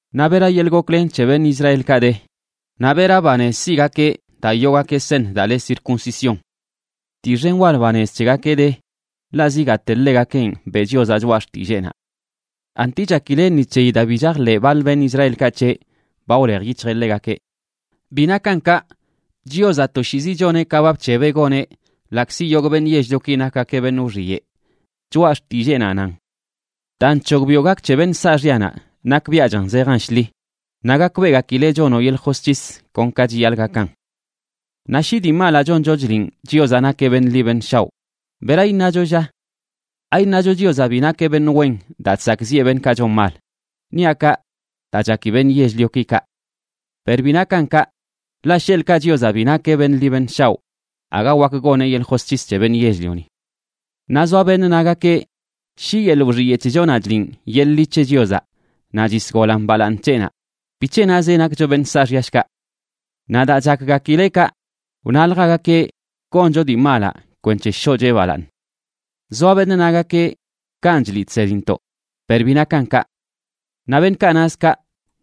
Naꞌ ¿bera yeḻꞌ goklen c̱he beṉꞌ Israelkaꞌ de? Naꞌ ¿bera banez siꞌgakeꞌ daa yoogakeꞌ seṉ daa le circuncisión? Dii xen wal banez c̱hegakeꞌ de. Ḻaꞌ zigaate, ḻegakenꞌ beꞌ Chiozaꞌ Choꞌa Xtilleenaꞌ. ¿Anti chakile ni c̱heyi daa bi chajḻeꞌ baḻ beṉꞌ Israelkaꞌ c̱heꞌ, ba wlej yic̱hjeꞌ ḻegakeꞌ? ¡Bi nakan kaꞌ! Chiozaꞌ toshiizi choneꞌ ka ba bc̱hebeꞌ goneꞌ ḻaꞌkzi yogꞌ beṉꞌ yell-lioki nakgakeꞌ beṉꞌ wxiyeꞌ. Choꞌa Xtilleenaꞌ nan: Daa nc̱hogbiꞌo gak c̱he beṉꞌ saaxyanaꞌ nakbiaꞌchan zejan shḻi, naꞌ gakbeꞌgakileꞌ chonoꞌ yeḻꞌ josc̱his kon ka chiyaḻꞌ gakan. Naꞌ shi dii malaꞌ choncho chliꞌn Chiozaꞌ nakeꞌ beṉꞌ ḻi beṉꞌ shaoꞌ, ¿bera iṉacho, lla? ¿Aiṉacho Chiozaꞌ bi nakeꞌ beṉꞌ wen daa chsakꞌziꞌe beṉꞌkaꞌ chon mal? (Niaꞌ kaꞌ daa chaki beṉꞌ yell-lioki kaꞌ.) Per ¡bi nakan kaꞌ! Ḻaꞌ, sheḻꞌkaꞌ Chiozaꞌ bi nakeꞌ beṉꞌ ḻi beṉꞌ shaoꞌ, aga wak goneꞌ yeḻꞌ josc̱his c̱he beṉꞌ yell-lioni. Naꞌ zoa beṉꞌ nagakeꞌ, shi yeḻꞌ wxiyeꞌ c̱hechonaꞌ chliꞌn yeḻꞌ ḻi c̱he Chiozaꞌ naꞌ chisgolan balaaṉ c̱heꞌnaꞌ, ¿bic̱he nazeꞌ nakcho beṉꞌ saaxya, shkaꞌ? Naꞌ daa chakgakileꞌ kaꞌ, wnaljagakeꞌ: “Goncho dii malaꞌ kwenc̱he shoꞌcheꞌ balaaṉ.” Zoa beṉꞌ nagakeꞌ kanꞌ chliꞌ chsedintoꞌ, per bi nakan kaꞌ. Naꞌ beṉꞌkaꞌ naz kaꞌ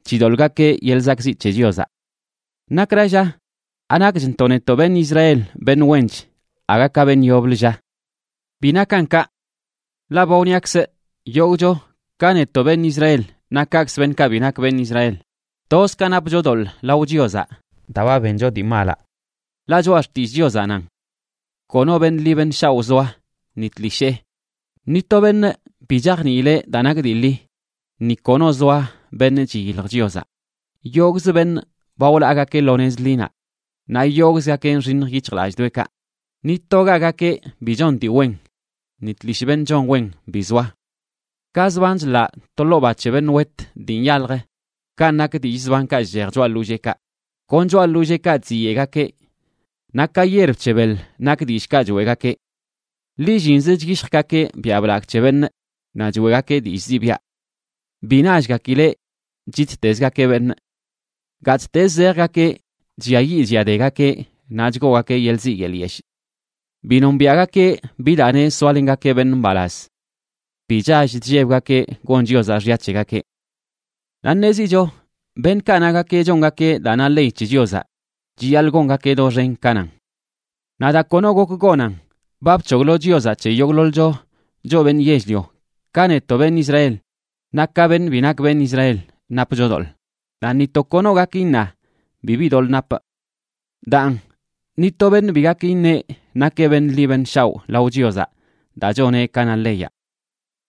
chidoḻꞌgakeꞌ yeḻꞌ zakꞌziꞌ c̱he Chiozaꞌ. ¿Nakra lla? ¿Anakchntoꞌ netoꞌ beṉꞌ Israel beṉꞌ wench aga ka beṉꞌ yoblə, lla? ¡Bi nakan kaꞌ! Ḻaꞌ ba wniakzꞌ yogꞌcho, ka netoꞌ beṉꞌ Israel naꞌ kaꞌkzə beṉꞌkaꞌ bi nak beṉꞌ Israel, toz ka napcho doḻꞌ lao Chiozaꞌ daa ba bencho dii malaꞌ. Ḻaꞌ Choꞌa Xtillꞌ Chiozaꞌ nan: Kono beṉꞌ ḻi beṉꞌ shaoꞌ zoa, ni tlishee. Ni to beṉꞌ bi chajniileꞌ daa nak dii ḻi, ni kono zoa beṉꞌ chiyilj Chiozaꞌ. Yogꞌz beṉꞌ ba wlaagakeꞌ lo nez ḻinaꞌ, naꞌ yogꞌzgakeꞌ nxiṉj yic̱hjlallꞌdoꞌekaꞌ. Ni togagakeꞌ bi chon dii wen. Ni tlishꞌ beṉꞌ chon wen bi zoa. Ka zban chḻaꞌ to ḻoo ba c̱he beṉꞌ wet dii nyalj, kanꞌ nak dillꞌ zbankaꞌ chchej choꞌa ḻolleekaꞌ. Kon choꞌa ḻolleekaꞌ chziyeꞌgakeꞌ. Naꞌ ka yierb c̱he beḻ nak dillꞌkaꞌ choeꞌgakeꞌ. Lillinzə chyishjgakeꞌ biaꞌ blagꞌ c̱he beṉꞌ naꞌ choeꞌgakeꞌ dillꞌ ziꞌbiaꞌ. Bi nallgakileꞌ chittezgakeꞌ beṉꞌ. Gattezə zejgakeꞌ chlliayiꞌ chlliadegakeꞌ naꞌ chgoogakeꞌ yeḻꞌ ziꞌ yeḻꞌ yeshꞌ. Bi nombiaꞌgakeꞌ bi daa neꞌ soalengakeꞌ beṉꞌ mbalaz. Bi chall chllebgakeꞌ gon Chiozaꞌ xya c̱hegakeꞌ. Naꞌ ṉezicho beṉꞌkaꞌ nagakeꞌ chongakeꞌ daa na ley c̱he Chiozaꞌ chiyaḻꞌ gongakeꞌ doxen ka nan. Naꞌ daa kono gok gonan, ba bc̱hoglo Chiozaꞌ c̱he yogꞌḻoḻcho, choꞌ beṉꞌ yell-lio, ka netoꞌ beṉꞌ Israel naꞌ ka beṉꞌ bi nak beṉꞌ Israel, napcho doḻꞌ, naꞌ ni to kono gak iṉa: “Bibi doḻꞌ napꞌ.” Daan, ni to beṉꞌ bi gak iṉeꞌ nakeꞌ beṉꞌ ḻi beṉꞌ shaoꞌ lao Chiozaꞌ daa choneꞌ ka na leyaꞌ.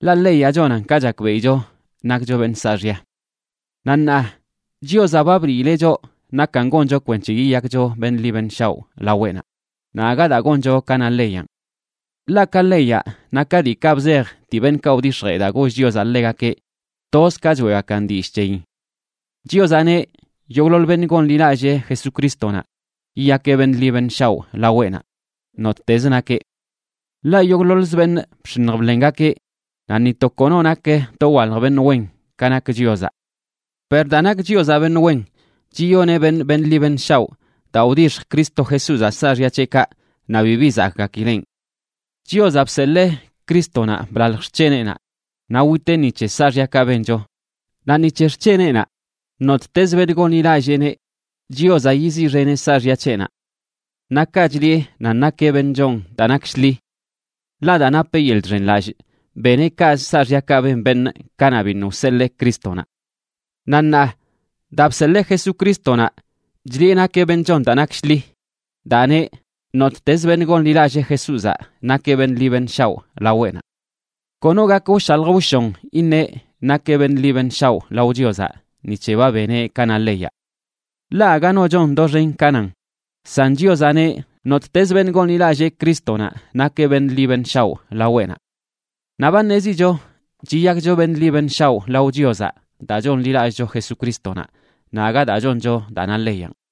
Ḻaꞌ leyaꞌ chonan ka chakbeꞌicho nakcho beṉꞌ saaxya. Naꞌ ṉaa Chiozaꞌ ba bliileꞌ choꞌ nakan goncho kwenc̱he yiyakcho beṉꞌ ḻi beṉꞌ shaoꞌ laweꞌnaꞌ, naꞌ aga daa goncho ka na leyanꞌ. Ḻaꞌ ka leyaꞌ, naꞌ ka diikaꞌ bzej dii beṉꞌkaꞌ wdix̱jee daa goll Chiozaꞌ ḻegakeꞌ, toz ka choeꞌgakan dillꞌ c̱heyin. Chiozaꞌ neꞌ yogꞌḻoḻ beṉꞌ gonḻilallee Jesucrístonaꞌ yiyakeꞌ beṉꞌ ḻi beṉꞌ shaoꞌ laweꞌnaꞌ, nottezə nakeꞌ. Ḻaꞌ yogꞌḻoḻzə beṉꞌ bx̱iṉj bḻengakeꞌ naꞌ ni to kono nak dowalj beṉꞌ wen ka nak Chiozaꞌ. Per daa nak Chiozaꞌ beṉꞌ wen, chiyoneꞌ beṉꞌ beṉꞌ ḻi beṉꞌ shaoꞌ daa wdixj Cristo Jesúzaꞌ saaxya c̱heꞌkaꞌ, naꞌ bibi zakꞌgakileꞌn. Chiozaꞌ bseḻee Crístonaꞌ blalj xc̱heneꞌnaꞌ naꞌ witeꞌ ni c̱he saaxyakaꞌ bencho. Naꞌ ni c̱he xc̱heneꞌnaꞌ, nottezə beṉꞌ gonḻilalleeneꞌ, Chiozaꞌ yiziꞌxeneꞌ saaxya c̱heꞌnaꞌ. Naꞌ kaꞌ chliꞌe nan nakeꞌ beṉꞌ chon daa nak shḻi. Ḻaꞌ daa napeꞌ yeḻꞌ chxenlallꞌ, beneꞌ kaꞌz saaxyakaꞌ ben beṉꞌ kanaꞌ biṉꞌ wseḻee Crístonaꞌ. Naꞌ ṉaa, daa bseḻee Jesucrístonaꞌ chliꞌe nakeꞌ beṉꞌ chon daa nak shḻi daa neꞌ nottezə beṉꞌ gonḻilallee Jesúzaꞌ nakeꞌ beṉꞌ ḻi beṉꞌ shaoꞌ laweꞌnaꞌ. Kono gak wshalj wshon iṉeꞌ nakeꞌ beṉꞌ ḻi beṉꞌ shaoꞌ lao Chiozaꞌ ni c̱he ba beneꞌ ka na leyaꞌ. Ḻaꞌ aga no chon doxen ka nan, san Chiozaꞌ neꞌ nottezə beṉꞌ gonḻilallee Crístonaꞌ nakeꞌ beṉꞌ ḻi beṉꞌ shaoꞌ laweꞌnaꞌ. Naꞌ ba ṉezicho chiyakcho beṉꞌ ḻi beṉꞌ shaoꞌ lao Chiozaꞌ daa chonḻilallꞌcho Jesucrístonaꞌ naꞌ aga daa choncho daa na leyanꞌ.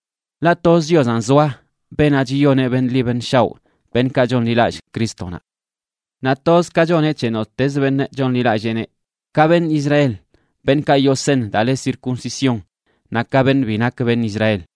Ḻaꞌ toz Chiozanꞌ zoa, beenaꞌ chiyoneꞌ beṉꞌ ḻi beṉꞌ shaoꞌ beṉꞌkaꞌ chonḻilallꞌ Crístonaꞌ. Naꞌ toz ka choneꞌ c̱he nottezə beṉꞌ chonḻilalleeneꞌ, ka beṉꞌ Israel, beṉꞌkaꞌ yoo seṉ daa le circuncisión, naꞌ ka beṉꞌ bi nak beṉꞌ Israel.